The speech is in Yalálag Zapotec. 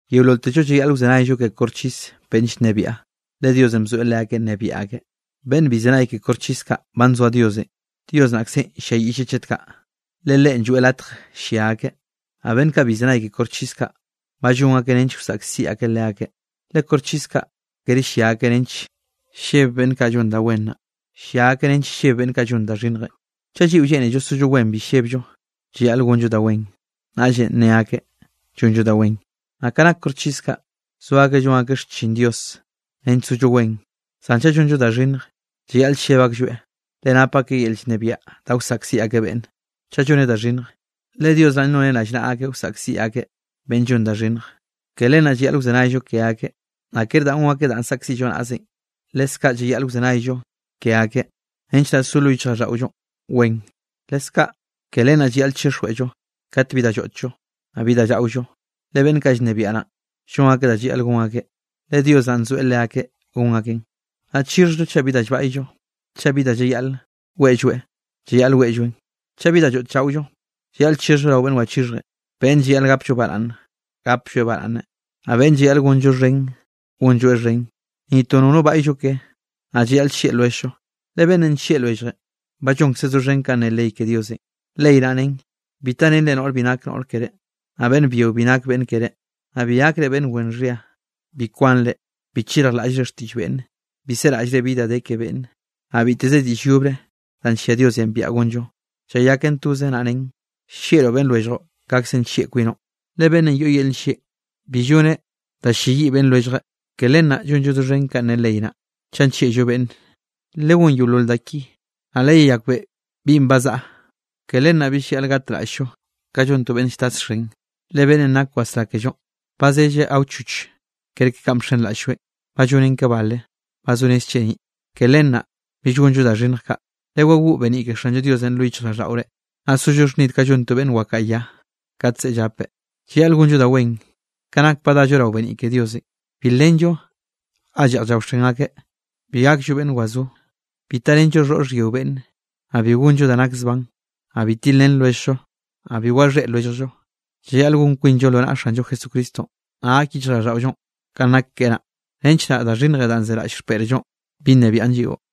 Yeololtello llayaꞌl wzenayllo ke koxchis beꞌnn llnebiaꞌ, le Diosenꞌ bzoeꞌ leakeꞌ nnebiaꞌ akeꞌ. Beꞌnnenꞌ bi llzenaye ke koxchis kaꞌ ba nzoa Diosenꞌ, Dios naꞌkzenꞌ ll-lliayiꞌlleꞌ chet kaꞌ, le Leꞌen lloeꞌ latj llia akeꞌ. Naꞌ beꞌnn kaꞌ bi llzenay ke koxchis kaꞌ, ba llon akeꞌ nench wsaꞌkziꞌ akeꞌ leakeꞌ. Le koxchis kaꞌ kere llia akeꞌ nench lleb beꞌnn kaꞌ llon da wen naꞌ, llia akeꞌ nench lleb beꞌnn kaꞌ llon da xhinnjenꞌ. Chaꞌ lliꞌo lleꞌnello sollo wen bi llebllo, llayaꞌl gonllo da wen, naꞌllenꞌ nne akeꞌ llonllo da wen. Ka nak koxchis kaꞌ, zo akeꞌ llon akeꞌ xchin Diosenꞌ nench sollo wen. Zan chaꞌ llonllo da xhinnj, llayaꞌl lleb aklloeꞌ, le nap akeꞌ yel llnebiaꞌ da wsaꞌkziꞌ akeꞌ beꞌnne, chaꞌ lloneꞌ da xhinnj, le Dios naꞌn noneꞌ rallnaꞌa akeꞌ wsaꞌkziꞌ akeꞌ beꞌnn llon da xhinnj. Ke len naꞌ llayaꞌl wzenayllo ke akeꞌ, naꞌ kere danꞌ gonn akeꞌ danꞌ saꞌkziꞌllo naꞌzenꞌ, leskaꞌ llayaꞌl wzenayllo ke akeꞌ nench naꞌ so lo yichjraꞌlldaꞌollo wen. Leskaꞌ ke len naꞌ llayaꞌl chixhjllo kat bi da lloꞌtllo, naꞌ bi da llaꞌollo, le beꞌnn kaꞌ llnebiaꞌ naꞌn, llon akeꞌ da llayaꞌl gon akeꞌ, le Dios naꞌn nzoeꞌ leakeꞌ gon akeꞌn. Naꞌ chixhjllo chaꞌ bi da llbaꞌyllo, chaꞌ beꞌnn bi da llayaꞌl weꞌlloeꞌ, llayaꞌl weꞌlloeꞌn, chaꞌ bi da lloꞌt llaꞌollo, llayaꞌl chixhjllo rao beꞌnn wachixhjenꞌ. Beꞌnn llayaꞌl gapllo baraꞌnn, gaplloeꞌ baraꞌnne, naꞌ beꞌnn llayaꞌl gonllo xhen, gonlloeꞌ xhen. Ni to nono baꞌyllo keꞌe, naꞌ llayaꞌl llieꞌ lwelljllo. Le beꞌnnenꞌ nllieꞌ lwelljeꞌn, ba llonkzeꞌ doxhen kanꞌ ne ley ke Diosenꞌ. Ley naꞌ nen: “Bi tarenre noꞌr bi nak noꞌr keré, naꞌ beꞌnn byio bi nak beꞌnn keré, naꞌ bi gakre beꞌnn wen xhia, bi kwanre, bi chirjlaꞌllre xtiꞌll beꞌnne, bi seraꞌllre bi da de ke beꞌnne.” Naꞌ biteze diꞌll yobre danꞌ nllia Diosenꞌ biaꞌa gonllo, llayaken toze, naꞌ nen: “Llieꞌroꞌ beꞌnn lwelljoꞌ kaꞌkzenꞌ nllieꞌ kwinoꞌ.” Le beꞌnne yoꞌ yel nllieꞌ, bibi lloneꞌ da ll-lleyiꞌ beꞌnn lwelljeꞌn. Ke len naꞌ llonllo doxhen kanꞌ ne ley naꞌ, chaꞌ nllieꞌllo beꞌnne. Legón yeolol ka da ki, naꞌ leyeyakbeꞌe binꞌ ba zaꞌa. Ke len naꞌ bill llayaꞌl gatraꞌll-llo ka llon to beꞌnn lltasxen. Le beꞌnnenꞌ nak wasrá kellonꞌ, ba zelleꞌe awchoch kerke kanꞌ bxenraꞌll-lloeꞌn. Ba llonen ka bale, ba zo rez cheniꞌ, ke len naꞌ bill gonllo da xhinnj kaꞌ. Lewagoꞌ beniꞌ ke Xanllo Diosenꞌ lo yichjraꞌlldaꞌore, naꞌ sollo xhnid ka llon to beꞌnn wakaꞌa ya kat zeꞌe llapeꞌ. Llayaꞌl gonllo da wen, ke nak ba dallo rao beniꞌ ke Diosenꞌ. Bi lenllo ga lleꞌj llaoxen akeꞌ, bi gakllo beꞌnn wazó, bi tarenllo xhoꞌr xhyio beꞌnne, naꞌ bi gonllo da nak zban, naꞌ bi tilrén lwelljllo, naꞌ bi waxhéꞌ lwelljllo. Llayaꞌl gon kwinllo lo naꞌa Xanllo Jesucristonꞌ, naꞌ gak yichjraꞌlldaꞌollonꞌ kanꞌ nak keꞌe naꞌ, nench naꞌ da xhinnjenꞌ danꞌ zeraꞌll xpeꞌrllonꞌ, bi nnebiaꞌn lliꞌo.